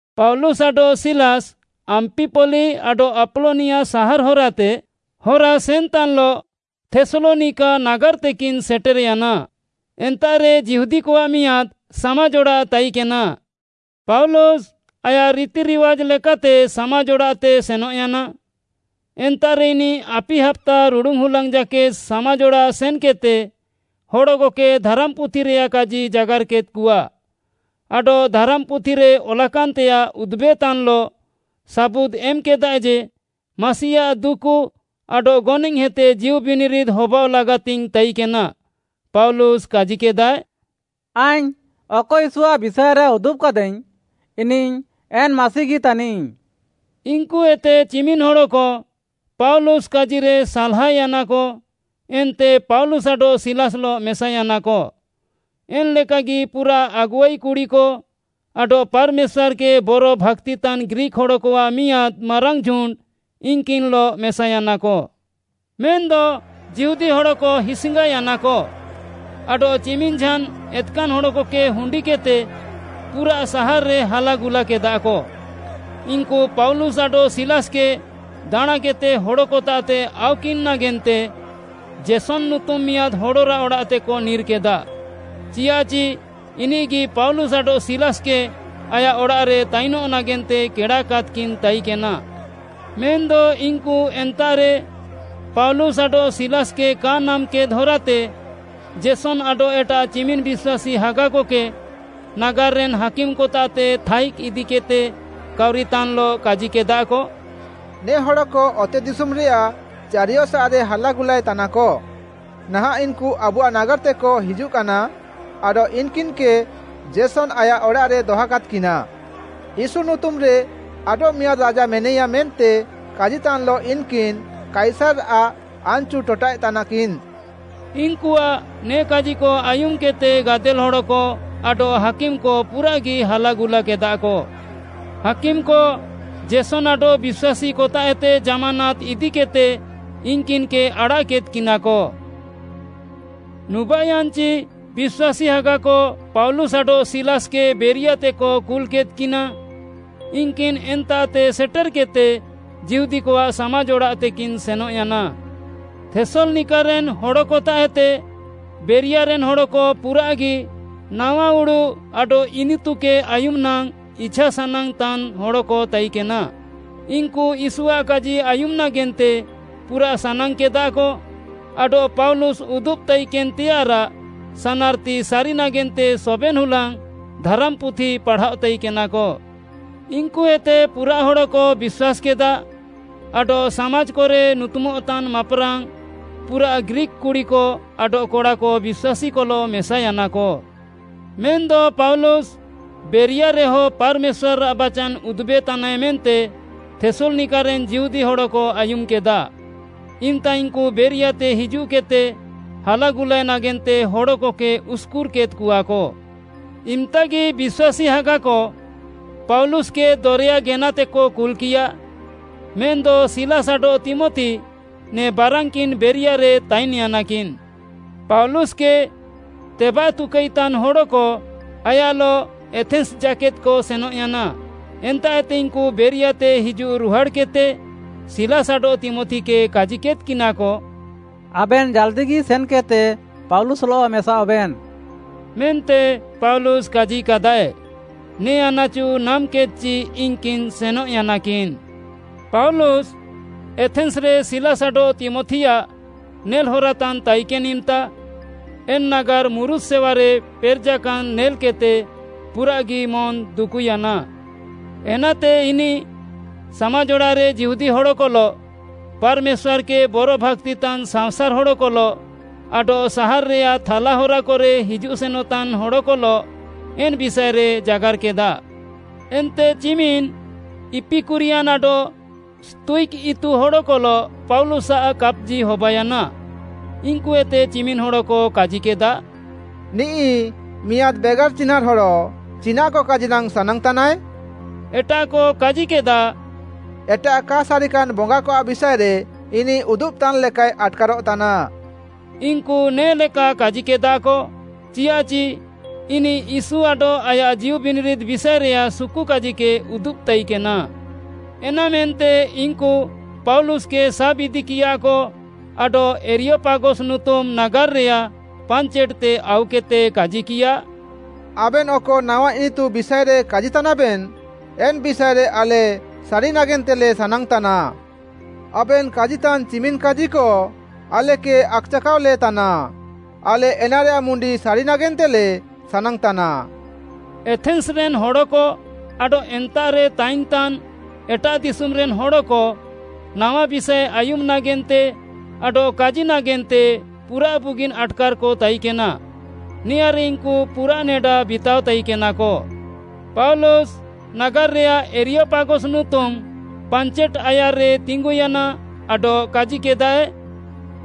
ପାଉଲୁସ୍‌ ଆଡଃ ସିଲାସ୍‌ ଆମ୍ପିପଲି ଆଡଃ ଆପଲୋନିଆ ସାହାର୍‌ ହରାତେ ହରାସେନ୍‌ତାନ୍‌ଲଃ ଥେସ୍‌ଲନିକା ନାଗାର୍‌ତେକିନ୍‌ ସେଟେର୍‌ୟାନା। ଏନ୍ତାଃରେ ଯିହୁଦୀକଆଃ ମିଆଁଦ୍‌ ସାମାଜ୍‌ ଅଡ଼ାଃ ତାଇକେନା। ପାଉଲୁସ୍‌ ଆୟାଃ ରିତିରିୱାଜ୍‌ ଲେକାତେ ସାମାଜ୍‌ ଅଡ଼ାଃତେ ସେନଃୟାନା। ଏନ୍ତାଃରେ ଇନିଃ ଆପି ହାପ୍ତା ରୁଡ଼ୁନ୍‌ ହୁଲାଙ୍ଗ୍‌ ଜାକେଦ୍‌ ସାମାଜ୍‌ ଅଡ଼ାଃ ସେନ୍‌କେଦ୍‌ତେ ହଡ଼କକେ ଧାରାମ୍‌ପୁଥିରେୟାଃ କାଜି ଜାଗାର୍‌କେଦ୍‌କଆ, ଆଡଃ ଧାରାମ୍‌ପୁଥିରେ ଅଲାକାନ୍‌ତେୟାଃ ଉଦୁବେତାନ୍‌ଲଃ ସାବୁଦ୍‌ ଏମ୍‌କେଦାଏ ଯେ, ମାସିଆଃ ଦୁକୁ ଆଡଃ ଗନଏଃହେତେ ଜୀଉ ବିନିରିଦ୍‌ ହବାଅଃ ଲାଗାତିଙ୍ଗ୍‌ ତାଇକେନା। ପାଉଲୁସ୍‌ କାଜିକେଦାଏ, “ଆଇଙ୍ଗ୍‌ ଅକ ୟୀଶୁଆଃ ବିଷାଏରେ ଉଦୁବ୍‌କାଦାଇଙ୍ଗ୍‌, ଇନିଃ ଏନ୍‌ ମାସିଗି ତାନିଃ।” ଇନ୍‌କୁଏତେ ଚିମିନ୍‍ ହଡ଼କ ପାଉଲୁସ୍‌ କାଜିରେ ସାଲ୍‌ହାୟାନାକ ଏନ୍ତେ ପାଉଲୁସ୍‌ ଆଡଃ ସିଲାସ୍‌ଲଃ ମେସାୟାନାକ, ଏନ୍‌ଲେକାଗି ପୁରାଃ ଆଗୁଆଇ କୁଡ଼ିକ ଆଡଃ ପାର୍‌ମେଶ୍ୱାର୍‌କେ ବରଭାକ୍ତିତାନ୍‌ ଗ୍ରୀକ୍‌ ହଡ଼କଆଃ ମିଆଁଦ୍‌ ମାରାଙ୍ଗ୍‌ ଝୁଣ୍ଡ୍‌ ଇନ୍‌କିନ୍‌ଲଃ ମେସାୟାନାକ। ମେନ୍‌ଦ ଯିହୁଦୀ ହଡ଼କ ହିସ୍‌ଙ୍ଗାୟାନାକ ଆଡଃ ଚିମିନ୍‌ ଝାନ୍‌ ଏତ୍‌କାନ୍‌ ହଡ଼କକେ ହୁଣ୍ଡିକେଦ୍‌ତେ ପୁରା ସାହାର୍‌ରେ ହାଲାଗୁଲାକେଦାକ। ଇନ୍‌କୁ ପାଉଲୁସ୍‌ ଆଡଃ ସିଲାସ୍‌କେ ଦାଣାଁକେଦ୍‌ତେ ହଡ଼କତାଃତେ ଆଉକିନ୍‌ ନାଗେନ୍ତେ ଜେସନ୍‌ ନୁତୁମ୍‌ ମିଆଁଦ୍‌ ହଡ଼ରାଃ ଅଡ଼ାଃତେକ ନିର୍‌କେଦା। ଚିଆଃଚି ଇନିଃଗି ପାଉଲୁସ୍‌ ଆଡଃ ସିଲାସ୍‌କେ ଆୟାଃ ଅଡ଼ାଃରେ ତାଇନଃ ନାଗେନ୍ତେ କେଡ଼ାକାଦ୍‌କିନ୍‌ ତାଇକେନା। ମେନ୍‌ଦ ଇନ୍‌କୁ ଏନ୍ତାଃରେ ପାଉଲୁସ୍‌ ଆଡଃ ସିଲାସ୍‌କେ କା ନାମ୍‌କେଦ୍‌ ହରାତେ, ଜେସନ୍‌ ଆଡଃ ଏଟାଃ ଚିମିନ୍‌ ବିଶ୍ୱାସୀ ହାଗାକକେ ନାଗାର୍‌ରେନ୍‌ ହାକିମ୍‌କତାଃତେ ଥାଇଜ୍‌ ଇଦିକେଦ୍‌ତେ କାଉରିତାନ୍‌ଲଃ କାଜିକେଦାକ, “ନେ ହଡ଼କ ଅତେଦିଶୁମ୍‌ରେୟାଃ ଚାରିୟସାଃରେ ହାଲାଗୁଲାଏ ତାନାକ, ନାହାଁଃ ଇନ୍‌କୁ ଆବୁଆଃ ନାଗାର୍‌ତେକ ହିଜୁଃକାନା, ଆଡଃ ଇନ୍‌କିନ୍‌କେ ଜେସନ୍‌ ଆୟାଃ ଅଡ଼ାଃରେ ଦହକାଦ୍‌କିନା। ୟୀଶୁ ନୁତୁମ୍‌ରେ ଆଡଃମିଆଁଦ୍‌ ରାଜା ମେନାଇୟା ମେନ୍ତେ କାଜିତାନ୍‌ଲଃ ଇନ୍‌କିନ୍‌ କାଇସାର୍‌ଆଃ ଆନ୍‌ଚୁ ଟଟାଃଏ ତାନାକିନ୍‌।” ଇନ୍‌କୁଆଃ ନେ କାଜିକ ଆୟୁମ୍‌କେଦ୍‌ତେ ଗାଦେଲ୍‌ ହଡ଼କ ଆଡଃ ହାକିମ୍‌କ ପୁରାଃଗି ହାଲାଗୁଲାକେଦାକ। ହାକିମ୍‌କ ଜେସନ୍‌ ଆଡଃ ବିଶ୍ୱାସୀକତାଃଏତେ ଜାମାନାତ୍‌ ଇଦିକେଦ୍‌ତେ ଇନ୍‌କିନ୍‌କେ ଆଡ଼ାଃକେଦ୍‌କିନାକ। ନୁବାଃୟାନ୍‌ଚି ବିଶ୍ୱାସୀ ହାଗାକ ପାଉଲୁସ୍‌ ଆଡଃ ସିଲାସ୍‌କେ ବେରିଆତେକ କୁଲ୍‌କେଦ୍‌କିନା। ଇନ୍‌କିନ୍‌ ଏନ୍ତାଃତେ ସେଟେର୍‌କେଦ୍‌ତେ ଯିହୁଦୀକଆଃ ସାମାଜ୍‌ ଅଡ଼ାଃତେକିନ୍‌ ସେନଃୟାନା। ଥେସ୍‌ଲନିକାରେନ୍‌ ହଡ଼କତାଃଏତେ ବେରିଆରେନ୍‌ ହଡ଼କ ପୁରାଃଗି ନାୱା ଉଡ଼ୁଃ ଆଡଃ ଇନିତୁକେ ଆୟୁମ୍‌ ନାଙ୍ଗ୍‌ ଇଛାସାନାଙ୍ଗ୍‌ତାନ୍‌ ହଡ଼କ ତାଇକେନା। ଇନ୍‌କୁ ୟୀଶୁଆଃ କାଜି ଆୟୁମ୍‌ ନାଗେନ୍ତେ ପୁରାଃ ସାନାଙ୍ଗ୍‌କେଦାକ ଆଡଃ ପାଉଲୁସ୍‌ ଉଦୁବ୍‌ ତାଇକେନ୍‌ତେୟାଃରାଃ ସାନାର୍‌ତି ସାରି ନାଗେନ୍ତେ ସବେନ୍‌ ହୁଲାଙ୍ଗ୍‌ ଧାରାମ୍‌ପୁଥି ପାଢ଼ାଅ ତାଇକେନାକ। ଇନ୍‌କୁଏତେ ପୁରାଃ ହଡ଼କ ବିଶ୍ୱାସ୍‌କେଦା। ଆଡଃ ସାମାଜ୍‌କରେ ନୁତୁମଃତାନ୍‌ ମାପ୍‌ରାଙ୍ଗ୍‌ ପୁରାଃ ଗ୍ରୀକ୍‌ କୁଡ଼ିକ ଆଡଃ କଡ଼ାକ ବିଶ୍ୱାସୀକଲଃ ମେସାୟାନାକ। ମେନ୍‌ଦ ପାଉଲୁସ୍‌ ବେରିଆରେହ ପାର୍‌ମେଶ୍ୱାର୍‌ଆଃ ବାଚାନ୍‌ ଉଦୁବେତାନାଏ ମେନ୍ତେ ଥେସ୍‌ଲନିକାରେନ୍‌ ଯିହୁଦୀ ହଡ଼କ ଆୟୁମ୍‌କେଦା, ଇମ୍‌ତା ଇନ୍‌କୁ ବେରିଆତେ ହିଜୁଃକେଦ୍‌ତେ ହାଲାଗୁଲାଏ ନାଗେନ୍ତେ ହଡ଼କକେ ଉସ୍‌କୁର୍‌କେଦ୍‌କଆକ। ଇମ୍‌ତାଗି ବିଶ୍ୱାସୀ ହାଗାକ ପାଉଲୁସ୍‌କେ ଦରେୟା ଗେନାତେକ କୁଲ୍‌କିୟା, ମେନ୍‌ଦ ସିଲାସ୍‌ ଆଡଃ ତୀମଥି ନେ ବାରାନ୍‌କିନ୍‌ ବେରିଆରେ ତାଇନ୍‌ୟାନାକିନ୍‌। ପାଉଲୁସ୍‍କେ ତେବାତୁକାଇତାନ୍‌ ହଡ଼କ ଆୟାଃଲଃ ଏଥେନ୍‌ସ୍‌ ଜାକେଦ୍‌କ ସେନଃୟାନା। ଏନ୍ତାଃଏତେ ଇନ୍‌କୁ ବେରିଆତେ ହିଜୁଃ ରୁହାଡ଼୍‌କେଦ୍‌ତେ ସିଲାସ୍‌ ଆଡଃ ତୀମଥିକେ କାଜିକେଦ୍‌କିନାକ, “ଆବେନ୍‌ ଜାଲ୍‌ଦିଗି ସେନ୍‌କେଦ୍‌ତେ ପାଉଲୁସ୍‌ଲଃ ମେସାଅଃବେନ୍‌” ମେନ୍ତେ ପାଉଲୁସ୍‌ କାଜିକାଦାଏ। ନେ ଆନାଚୁ ନାମ୍‌କେଦ୍‌ଚି ଇନ୍‌କିନ୍‌ ସେନଃୟାନାକିନ୍‌। ପାଉଲୁସ୍‌ ଏଥେନ୍‌ସ୍‌ରେ ସିଲାସ୍‌ ଆଡଃ ତୀମଥିଆଃ ନେଲ୍‌ହରାତାନ୍‌ ତାଇକେନ୍‌ ଇମ୍‌ତା, ଏନ୍‌ ନାଗାର୍‌ ମୁରୁତ୍‌ ସେୱାରେ ପେରେଜାକାନ୍‌ ନେଲ୍‌କେଦ୍‌ତେ ପୁରାଃଗି ମନ୍‌ଦୁକୁୟାନା। ଏନାତେ ଇନିଃ ସାମାଜ୍‌ ଅଡ଼ାଃରେ ଯିହୁଦୀ ହଡ଼କଲଃ, ପାର୍‌ମେଶ୍ୱାର୍‌କେ ବରଭାକ୍ତିତାନ୍‌ ସାଅଁସାର୍‌ ହଡ଼କଲଃ, ଆଡଃ ସାହାର୍‌ରେୟାଃ ଥାଲା ହରାକରେ ହିଜୁଃ ସେନଃତାନ୍‌ ହଡ଼କଲଃ ଏନ୍‌ ବିଷାଏରେ ଜାଗାର୍‌କେଦା। ଏନ୍ତେ ଚିମିନ୍‌ ଇପିକୁରିୟାନ୍‌ ଆଡଃ ସ୍ତୋୟିକ୍‌ ଇତୁ ହଡ଼କଲଃ ପାଉଲୁସ୍‌ଆଃ କାପ୍‌ଜି ହବାୟାନା। ଇନ୍‌କୁଏତେ ଚିମିନ୍‌ ହଡ଼କ କାଜିକେଦା, “ନିଃ ମିଆଁଦ୍‌ ବେଗାର୍‌ ଚିହ୍ନାଁର୍‌ ହଡ଼, ଚିନାଃକ କାଜି ନାଙ୍ଗ୍‌ ସାନାଙ୍ଗ୍‌ତାନାଏ?” ଏଟାଃକ କାଜିକେଦା, “ଏଟାଃ କା ସାରିକାନ୍‌ ବଙ୍ଗାକଆଃ ବିଷାଏରେ ଇନିଃ ଉଦୁବ୍‌ତାନ୍‌ ଲେକାଏ ଆଟ୍‌କାରଃତାନା।” ଇନ୍‌କୁ ନେ'ଲେକା କାଜିକେଦାକ ଚିଆଃଚି ଇନିଃ ୟୀଶୁ ଆଡଃ ଆୟାଃ ଜୀଉବିନିରିଦ୍‌ ବିଷାଏରେୟାଃ ସୁକୁକାଜିକେ ଉଦୁବ୍‌ତାଇକେନା। ଏନାମେନ୍ତେ ଇନ୍‌କୁ ପାଉଲୁସ୍‌କେ ସାବ୍‌ଇଦିକିୟାକ ଆଡଃ ଏରିୟପାଗସ୍‌ ନୁତୁମ୍‌ ନାଗାର୍‌ରେୟାଃ ପାଞ୍ଚେଟ୍‌ତେ ଆଉକେଦ୍‌ତେ କାଜିକିୟା, “ଆବେନ୍‌ ଅକ ନାୱା ଇନିତୁ ବିଷାଏରେ କାଜିତାନାବେନ୍‌, ଏନ୍‌ ବିଷାଏରେ ଆଲେ ସାରି ନାଗେନ୍ତେଲେ ସାନାଙ୍ଗ୍‌ତାନା। ଆବେନ୍‌ କାଜିତାନ୍‌ ଚିମିନ୍‌ କାଜିକ ଆଲେକେ ଆକ୍‌ଚାକାଅଲେ ତାନା। ଆଲେ ଏନାରେୟାଃ ମୁଣ୍ଡି ସାରି ନାଗେନ୍ତେଲେ ସାନାଙ୍ଗ୍‌ତାନା।” ଏଥେନ୍‌ସ୍‌ରେନ୍‌ ହଡ଼କ ଆଡଃ ଏନ୍ତାଃରେ ତାଇନ୍‌ତାନ୍‌ ଏଟାଃ ଦିଶୁମ୍‌ରେନ୍‌ ହଡ଼କ ନାୱା ବିଷାଏ ଆୟୁମ୍‌ ନାଗେନ୍ତେ ଆଡଃ କାଜି ନାଗେନ୍ତେ ପୁରାଃ ବୁଗିନ୍‌ ଆଟ୍‌କାର୍‌କ ତାଇକେନା। ନେଆଁରେ ଇନ୍‌କୁ ପୁରାଃ ନେଡା ବିତାଅ ତାଇକେନାକ। ପାଉଲୁସ୍‌ ନାଗାର୍‌ରେୟାଃ ଏରିୟପାଗସ୍‌ ନୁତୁମ୍‌ ପାଞ୍ଚେଟ୍‌ ଆୟାର୍‌ରେ ତିଙ୍ଗୁୟାନା ଆଡଃ କାଜିକେଦାଏ,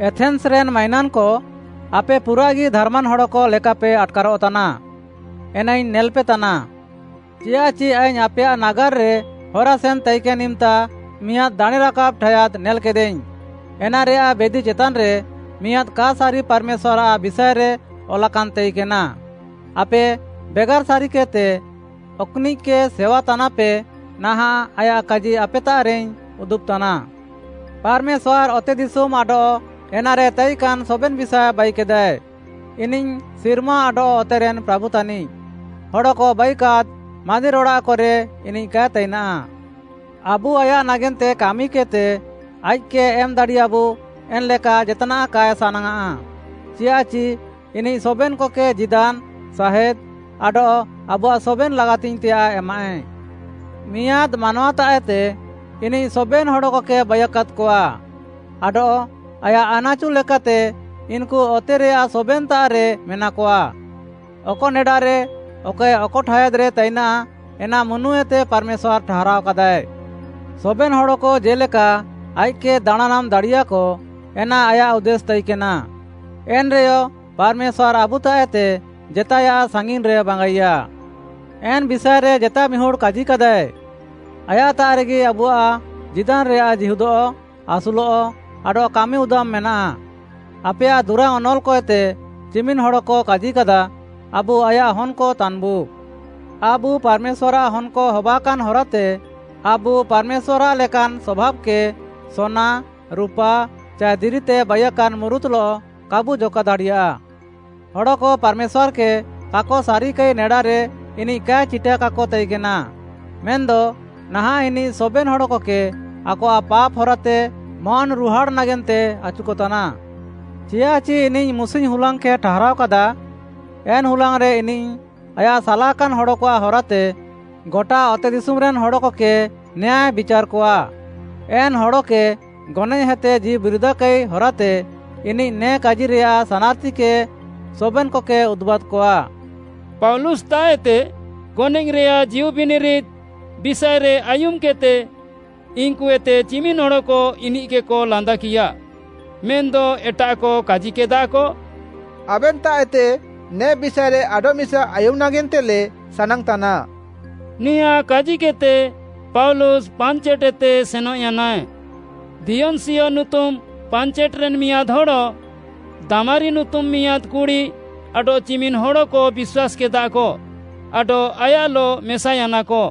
“ଏଥେନ୍‌ସ୍‌ରେନ୍‌ ମାଇନାନ୍‌କ, ଆପେ ପୁରାଃଗି ଧାର୍‌ମାନ୍‌ ହଡ଼କ ଲେକାପେ ଆଟ୍‌କାରଃତାନା, ଏନାଇଙ୍ଗ୍‌ ନେଲ୍‌ପେ ତାନା। ଚିୟାଃଚି ଆଇଙ୍ଗ୍‌ ଆପେୟାଃ ନାଗାର୍‌ରେ ହରାସେନ୍‌ ତାଇକେନ୍‌ ଇମ୍‌ତା, ମିଆଁଦ୍‌ ଦାଣେଁ ରାକାବ୍‌ ଠାୟାଦ୍‌ ନେଲ୍‌କେଦାଇଙ୍ଗ୍‌, ଏନାରେୟାଃ ବେଦି ଚେତାନ୍‌ରେ ‘ମିଆଁଦ୍‌ କା ସାରି ପାର୍‌ମେଶ୍ୱାର୍‌ଆଃ ବିଷାଏରେ’ ଅଲାକାନ୍‌ ତାଇକେନା। ଆପେ ବେଗାର୍‌ ସାରିକେଦ୍‌ତେ ଅକ୍‌ନିଃକେ ସେୱାତାନାପେ, ନାହାଁଃ ଆୟାଃ କାଜି ଆପେତାଃରେଇଙ୍ଗ୍‌ ଉଦୁବ୍‌ତାନା। ପାର୍‌ମେଶ୍ୱାର୍‌ ଅତେଦିଶୁମ୍‌ ଆଡଃ ଏନାରେ ତାଇକାନ୍‌ ସବେନ୍‌ ବିଷାଏ ବାଇକେଦାଏ। ଇନିଃ ସିର୍ମା ଆଡଃ ଅତେରେନ୍‌ ପ୍ରାଭୁ ତାନିଃ। ହଡ଼କ ବାଇକାଦ୍‌ ମାନ୍ଦିର୍‌ଅଡ଼ାଃକରେ ଇନିଃ କାଏ ତାଇନାଃ। ଆବୁ ଆୟାଃ ନାଗେନ୍ତେ କାମିକେଦ୍‌ତେ ଆଇଃକ୍‌କେ ଏମ୍‌ ଦାଡ଼ିୟାବୁ ଏନ୍‌ଲେକା ଜେତ୍‌ନାଃ କାଏ ସାନାଙ୍ଗ୍‌ଆଃ, ଚିୟାଃଚି ଇନିଃ ସବେନ୍‌କକେ ଜୀଦାନ୍‌, ସାହେଁଦ୍‌ ଆଡଃ ଆବୁଆଃ ସବେନ୍‌ ଲାଗାତିଙ୍ଗ୍‌ତେୟାଃ ଏମାଃଏ। ମିଆଁଦ୍‌ ମାନୱାତାଃଏତେ ଇନିଃ ସବେନ୍‌ ହଡ଼କକେ ବାଇୟାକାଦ୍‌କଆ ଆଡଃ ଆୟାଃ ଆନାଚୁ ଲେକାତେ ଇନ୍‌କୁ ଅତେରେୟାଃ ସବେନ୍‌ତାଃରେ ମେନାକଆ। ଅକ ନେଡାରେ, ଅକଏ ଅକ ଠାୟାଦ୍‌ରେ ତାଇନା, ଏନା ମୁନୁଏତେ ପାର୍‌ମେଶ୍ୱାର୍‌ ଠାହାରାଅକାଦାଏ। ସବେନ୍‌ ହଡ଼କ ଜେ'ଲେକା ଆଇଃକ୍‌କେ ଦାଣାଁନାମ୍‌ ଦାଡ଼ିୟାଃକ, ଏନା ଆୟାଃ ଉଦ୍ଦେଶ୍‌ ତାଇକେନା। ଏନ୍‌ରେୟ ପାର୍‌ମେଶ୍ୱାର୍‌ ଆବୁତାଃଏତେ ଜେତାଏୟାଃ ସାଙ୍ଗିନ୍‌ରେ ବାଙ୍ଗାଇୟା। ଏନ୍‌ ବିଷାଏରେ ଜେତାଏ ମିହୁଡ଼୍‌ କାଜିକାଦାଏ, “ଆୟାଃତାଃରେଗି ଆବୁଆଃ ଜୀଦାନ୍‌ରେୟାଃ ଜୀହୁଦଃ, ଆସୁଲଃ, ଆଡଃ କାମି ଉଦାମ୍‌ ମେନାଃ।” ଆପେୟାଃ ଦୁରାଙ୍ଗ୍‌ ଅନଲ୍‌କଏତେ ଚିମିନ୍‌ ହଡ଼କ କାଜିକାଦା, “ଆବୁ ଆୟାଃ ହନ୍‌କ ତାନ୍‌ବୁ। ଆବୁ ପାର୍‌ମେଶ୍ୱାର୍‌ଆଃ ହନ୍‌କ ହବାକାନ୍‌ ହରାତେ, ଆବୁ ପାର୍‌ମେଶ୍ୱାର୍‌ଆଃ ଲେକାନ୍‌ ସଭାବ୍‌କେ ସୋନା, ରୁପା ଚାଏ ଦିରିତେ ବାଇୟାକାନ୍‌ ମୁରୁତ୍‌ଲଃ କାବୁ ଜକା ଦାଡ଼ିୟା। ହଡ଼କ ପାର୍‌ମେଶ୍ୱାର୍‌କେ କାକ ସାରିକାଇ ନେଡାରେ ଇନିଃ କାଏ ଚିଟାକାକ ତାଇକେନା, ମେନ୍‌ଦ ନାହାଁଃ ଇନିଃ ସବେନ୍‌ ହଡ଼କକେ ଆକଆଃ ପାପ୍‌ ହରାଏତେ ମନ୍‌ରୁହାଡ଼୍‌ ନାଗେନ୍ତେ ଆଚୁକତାନା। ଚିୟାଃଚି ଇନିଃ ମୁସିଙ୍ଗ୍‌ ହୁଲାଙ୍ଗ୍‌କେ ଠାହାରାଅକାଦା। ଏନ୍‌ ହୁଲାଙ୍ଗ୍‌ରେ ଇନିଃ ଆୟାଃ ସାଲାକାନ୍‌ ହଡ଼କଆଃ ହରାତେ ଗଟା ଅତେଦିଶୁମ୍‌ରେନ୍‌ ହଡ଼କକେ ନ୍ୟାୟ ବିଚାର୍‌କଆ। ଏନ୍‌ ହଡ଼କେ ଗନଏଃହେତେ ଜୀଉବିରିଦ୍‌କାଇ ହରାତେ ଇନିଃ ନେ କାଜିରେୟାଃ ସାନାର୍‌ତିକେ ସବେନ୍‌କକେ ଉଦୁବ୍‌କାଦ୍‌କଆ।” ପାଉଲୁସ୍‌ତାଃଏତେ ଗନଏଃରେୟାଃ ଜୀଉବିନିରିଦ୍‌ ବିଷାଏରେ ଆୟୁମ୍‌କେଦ୍‌ତେ ଇନ୍‌କୁଏତେ ଚିମିନ୍‌ ହଡ଼କ ଇନିଃକେକ ଲାନ୍ଦାକିୟା, ମେନ୍‌ଦ ଏଟାଃକ କାଜିକେଦାକ, “ଆବେନ୍‌ତାଃଏତେ ନେ ବିଷାଏରେ ଆଡଃମିସା ଆୟୁମ୍‌ ନାଗେନ୍ତେଲେ ସାନାଙ୍ଗ୍‌ତାନା।” ନେଆଁ କାଜିକେଦ୍‌ତେ ପାଉଲୁସ୍‌ ପାଞ୍ଚେଟ୍‌ଏତେ ସେନଃୟାନାଏ। ଦିୟନ୍‌ସିୟ ନୁତୁମ୍‌ ପାଞ୍ଚେଟ୍‌ରେନ୍‌ ମିଆଁଦ୍‌ ହଡ଼, ଦାମାରୀ ନୁତୁମ୍‌ ମିଆଁଦ୍‌ କୁଡ଼ି ଆଡଃ ଚିମିନ୍‌ ହଡ଼କ ବିଶ୍ୱାସ୍‌କେଦାକ ଆଡଃ ଆୟାଃଲଃ ମେସାୟାନାକ।